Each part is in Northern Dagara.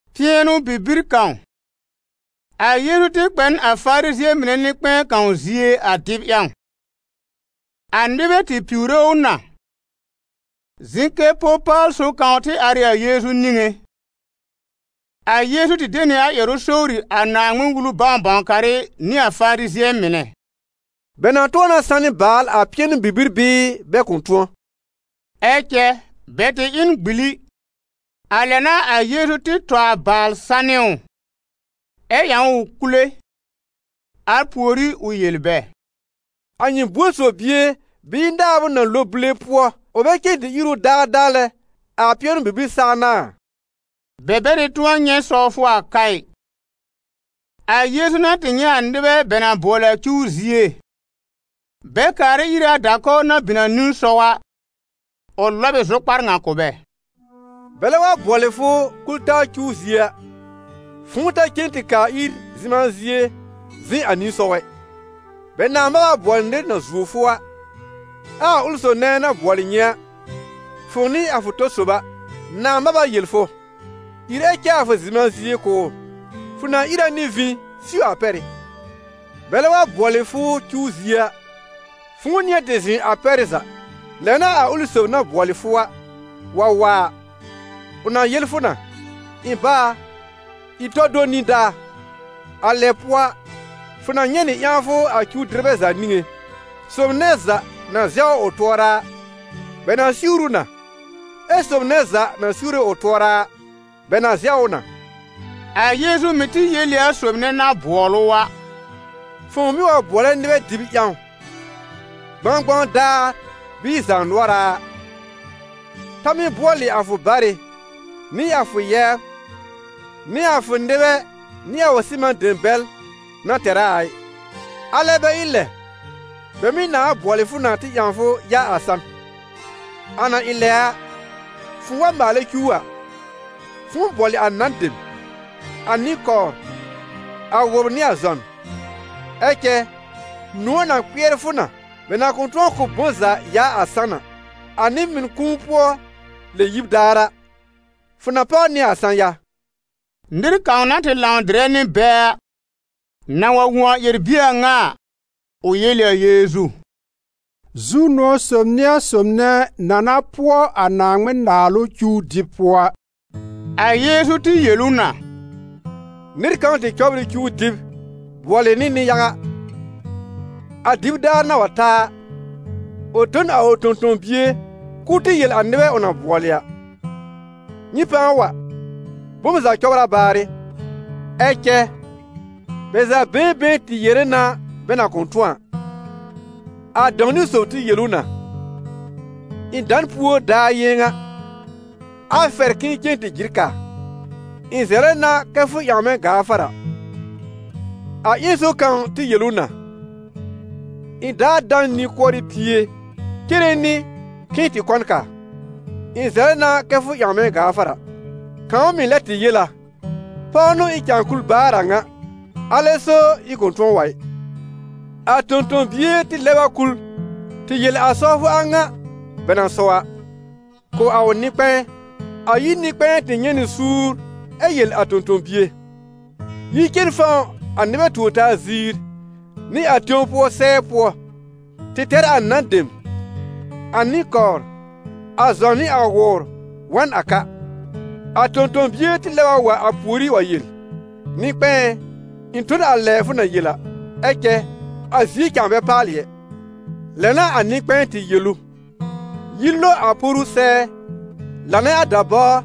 Pɩɛnʋ-bibir kãw, a Yeezu tɩ kpɛ n a Farizɩ̃ɛ mɩnɛ nɩ-kpɛ̃ɛ kãw zie a dɩb ƴãw; a nɩbɛ tɩ piwre ʋ na. Zɩ̃ kɛ po-paal sob kãw tɩ ar ɩ a Yeezu niŋé. A Yeezu tɩ de nɩ a ƴɛrʋ sowri a Naaŋmɩn-Wulu bãw-bãw-karɩ nɩ a Farizɩ̃ɛ mɩnɛ: «Bɛ na tʋ̃ɔ na sanɩ baal a pɩɛnʋ-bibir bɩɩ bɛ kʋ̃ tʋ̃ɔ?» Ɛ cɛ bɛ tɩ ɩ n gbili. A lɛ n'a a Yeezu tɩ tɔ a baal sanɩ ʋ, ɛ ƴãw ʋ kule. Al pùorí ʋ yel bɛ: «A nyɩ buor sob bie bɩɩ naab ʋ na lo bule pʋɔ ʋ bɛ cen tɩ ír ʋ daadaa lɛ, a pɩɛnʋ-bibir saa n'a a?» Bɛ bɛ tɩ tʋ̃ɔ nyɛ̃ sɔwfʋ a ka ɩ. A Yeezu na tɩ nyɛ̃ a nɩbɛ bɛ na bʋɔlɩ a cuw zie, bɛ kaarɛ ire a da-kɔwr na bin a nisɔw a, ʋ lɔb ɩ zʋkpar ŋa kʋ̀ bɛ: «Bɛlɛ wa bʋɔlɩ fʋ kul-taa cuw zie a, fʋ̃ʋ ta cen tɩ kaa ir zɩ̃ma zie zɩ̃ a nisɔw ɛ. Bɛ nãa mab a bʋɔlɩ nɩr na zuo fʋ a, ɛ a ʋlɩ sob nɛ na bʋɔlɩ nyɩ a, fʋ̃ʋ nɩ a fʋ tɔ sob a, nãà mab a yel fʋ: ‹Ìr ɛ cɛ a fʋ zɩ̃ma zie kʋ̀ ʋ.› Fʋ na ìr a nɩ vĩ siw a pɛ́rɩ́. Bɛlɛ wa bʋɔlɩ fʋ cuw zie a, fʋ̃ʋ nɩ̃ɛ tɩ zɩ̃ a pɛ́rɩ́ za. Lɛ n'a a ʋlɩ sob na bʋɔlɩ fʋ a, wa wa a, ʋ na yel fʋ na: ‹Ɩ̃ bá a, ìr tɔl do nĩdaa.› A lɛ pʋɔ a, fʋ na nyɛ̃ nɩ ƴãwfʋ a cuw-dɩrbɛ za niŋé. Sob nɛ za na zɛwr ʋ tʋɔra a, bɛ na siwr ʋ na, ɛ sob nɛ za na siwre ʋ tʋɔra a, bɛ na zɛw ʋ na.» A Yeezu mɩ̀ tɩ yel ɩ a sob nɛ na bʋɔl ʋ a: «Fʋ̃ʋ mɩ́ wa bʋɔlɛ nɩbɛ dɩb ƴãw, gbãgbãw daar bɩɩ zaanʋɔra a, ta mɩ́ bʋɔlɩ a fʋ barɩ, nɩ a fʋ yɛbr, nɩ a fʋ nɩbɛ nɩ a fʋ sɩman dem bɛl na tɛr a a ɩ, alɛ bɛ ɩ lɛ, bɛ mɩ́ nãa bʋɔlɩ fʋ na tɩ ƴãw fʋ yaa a san. A na ɩ lɛ a, fʋ̃ʋ wa maalɛ cuw a, fʋ̃ʋ bʋɔlɩ a nan dem, a nɩ-kɔwr, a wʋbr nɩ a zɔn. Ɛ cɛ nʋ̃ɔ̀ na kpɩɛr fʋ na, bɛ na kʋ̃ tʋ̃ɔ kʋ̀ b bom za yaa a san a. A nɩ-mɩn kũu-pʋɔ-lɛ-yib daar a, fʋ na páw nɩ a sã-ya.» Nɩr kãw na tɩ lãw dɩrɛ nɩ bɛ a, na wa wõ a ƴɛr-bie a ŋa a, ʋ yel ɩ a Yeezu: «Zu-nʋ̃ɔ̀ sob n'ɩ a sob nɛ na na pʋɔ a Naaŋmɩn-Naalʋ cuw dɩb pʋɔ a!» A Yeezu tɩ yel ʋ na: «Nɩr kãw tɩ cɔbr ɩ cuw dɩb bʋɔlɩ nɩ nɩ-yaga. A dɩb daar na wa ta a, ʋ tõ n a ʋ tõ-tõ-bie k'ʋʋ tɩ yel a nɩbɛ ʋ na bʋɔlɩ a: ‹Nyɩ pãa wa, bom za cɔbr a baarɩ!› Ɛ cɛ bɛ za been been tɩ yere na bɛ na kʋ̃ tʋ̃ɔ a. A dãw-niwn sob tɩ yel ʋ na: ‹Ɩ̃ da n púo daar yɩ̃ɛ ŋa, a fɛr k'ɩ̃ɩ cen tɩ jɩr kaa; ɩ̃ zɛlɛ na kɛ fʋ ƴãw mɛ̃ gaafara.› A ƴẽn sob kãw tɩ yel ʋ na: ‹Ɩ̃ daar dà n nĩ-kʋɔrɩ pie cere nɩ k'ɩ̃ɩ tɩ kɔ n kaa; ɩ̃ zɛlɛ na kɛ fʋ ƴãw mɛ̃ gaafara.› Kãw mɩ̀ lɛ tɩ yel a: ‹Pɔw n'ʋ ɩ̃ cãa kul baar a ŋa, alɛ so ɩ̃ kʋ̃ tʋ̃ɔ wa ɩ.› A tõ-tõ-bie tɩ lɛb a kul tɩ yel a sɔwfʋ a ŋa, bɛ na sɔw a, kʋ̀ a ʋ nɩ-kpɛ̃ɛ. A yir nɩ-kpɛ̃ɛ tɩ nyɛ̃ nɩ suur ɛ yel a tõ-tõ-bie: ‹Yi cen fɔ̃w a nɩbɛ tuor-taa ziir, nɩ a tẽw pʋɔ sɛɛ pʋɔ tɩ tɛr a nan dem, a nɩ-kɔwr, a zɔn nɩ a wʋbr wa n a ka.› A tõ-tõ-bie tɩ lɛb a wa a pùorí wa yel: ‹Nɩ-kpɛ̃ɛ ɛ, ɩ̃ tõ n a lɛ fʋ na yel a, ɛ cɛ a zie cãa bɛ paalɩ ɛ!› Lɛ n'a a nɩ-kpɛ̃ɛ tɩ yel ʋ: ‹Yi lo a poru sɛɛ, lanɛ a dabáwr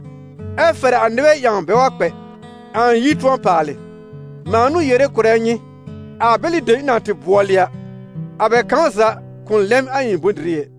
ɛ fɛr a nɩbɛ ƴãw bɛ wa kpɛ, a ɩ̃ yir tʋ̃ɔ paalɩ. Mãa n'ʋ yere kʋ̀rɛ nyɩ, a bɛlɩ dem ɩ̃ na tɩ bʋɔlɩ a, a bɛ kãw za kʋ̃ lɛm a ɩ̃ bʋ̃-dɩrɩ ɛ.›»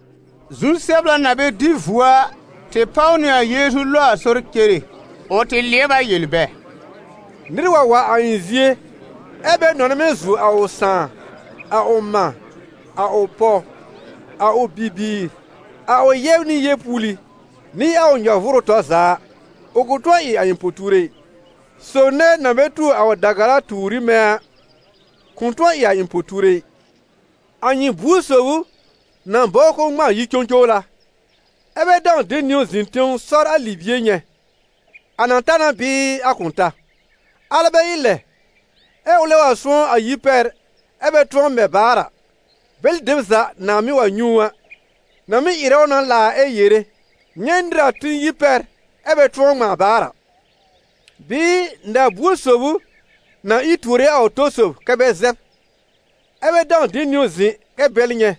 Zu-sɛbla na bɛ dɩ vuo a, tɩ páw nɩ a Yeezu lo a sɔr cere. Ʋ tɩ lɩɛb a yel bɛ: «Nɩr wa wa a ɩ̃ zie ɛ bɛ nɔnɛ mɛ̃ zuo a ʋ sãà, a ʋ mã, a ʋ pɔw, a ʋ bibiir, a ʋ yɛbr nɩ yeepuuli, nɩ a ʋ nyɔ-vʋʋrʋ tɔr za a, ʋ kʋ̃ tʋ̃ɔ ɩ a ɩ̃ po-tuure ɩ. Sob nɛ na bɛ tuo a ʋ da-gara tuur ɩ mɛ̃ a, kʋ̃ tʋ̃ɔ ɩ a ɩ̃ po-tuure ɩ. A nyɩ buor sob ʋ na bɔbr k'ʋʋ ŋmãa yi-cõcowla, ɛ́ bɛ dãw de niwn zɩ̃ tẽw sɔr a libie nyɛ̃, a na ta na bɩɩ a kʋ̃ ta. Alɛ bɛ ɩ lɛ, ɛ ʋlɛ wa sʋ̃ɔ́ a yir pɛr ɛ bɛ tʋ̃ɔ mɛ baar a, bɛlɩ dem za nãa mɩ́ wa nyɛ̃ ʋ a, na mɩ́ ɩrɛ ʋ na laar, ɛ yere: ‹Nyɛ̃ nɩr na tĩ yir pɛr, ɛ bɛ tʋ̃ɔ ŋmãa baar a!› Bɩɩ, na-buor sob ʋ na ìr tuore a ʋ tɔ sob kɛ́ bɛ zɛb, ɛ́ bɛ dãw de niwn zɩ̃ kɛ bɛl nyɛ̃,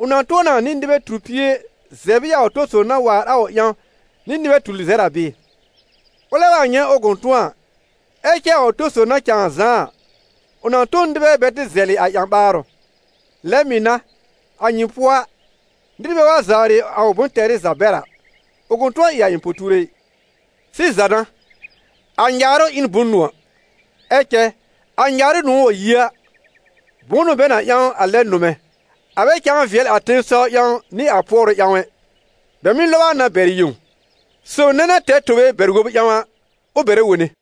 ʋ na tʋ̃ɔ na nɩ nɩbɛ tur pie zɛb ɩ a ʋ tɔ sob na waar a ʋ ƴãw nɩ nɩbɛ tur lɩzɛr a bɩɩ? Ʋlɛ wa nyɛ̃ ʋ kʋ̃ tʋ̃ɔ a, ɛ cɛ a ʋ tɔ sob na cãa zãá a, ʋ na tõ n nɩbɛ bɛ tɩ zɛlɩ a ƴã-ɓaarʋ. Lɛ mɩ̀ n'a, a nyɩ pʋɔ a, nɩr bɛ wa zawrɩ a ʋ bʋ̃-tɛrɩ za bɛr a, ʋ kʋ̃ tʋ̃ɔ ɩ a ɩ̃ po-tuure ɩ.» «Sɩza n'a, a nyaarʋ ɩ n bʋ̃-nʋ̃ɔ̀. Ɛ cɛ a nyaarʋ nʋ̃ɔ̀ wa yi a, bʋ̃ʋ n'ʋ bɛ na ƴãw a lɛb nʋmɛ̃? A bɛ cãa vɩɛl a tẽsɔw ƴãw nɩ a pʋɔrʋ ƴãw ɛ, bɛ mɩ́ lɔb a na bɛr yẽw. Sob nɛ na tɛr tobe bɛr-wob ƴãw a, ʋ bɛrɛ wone.»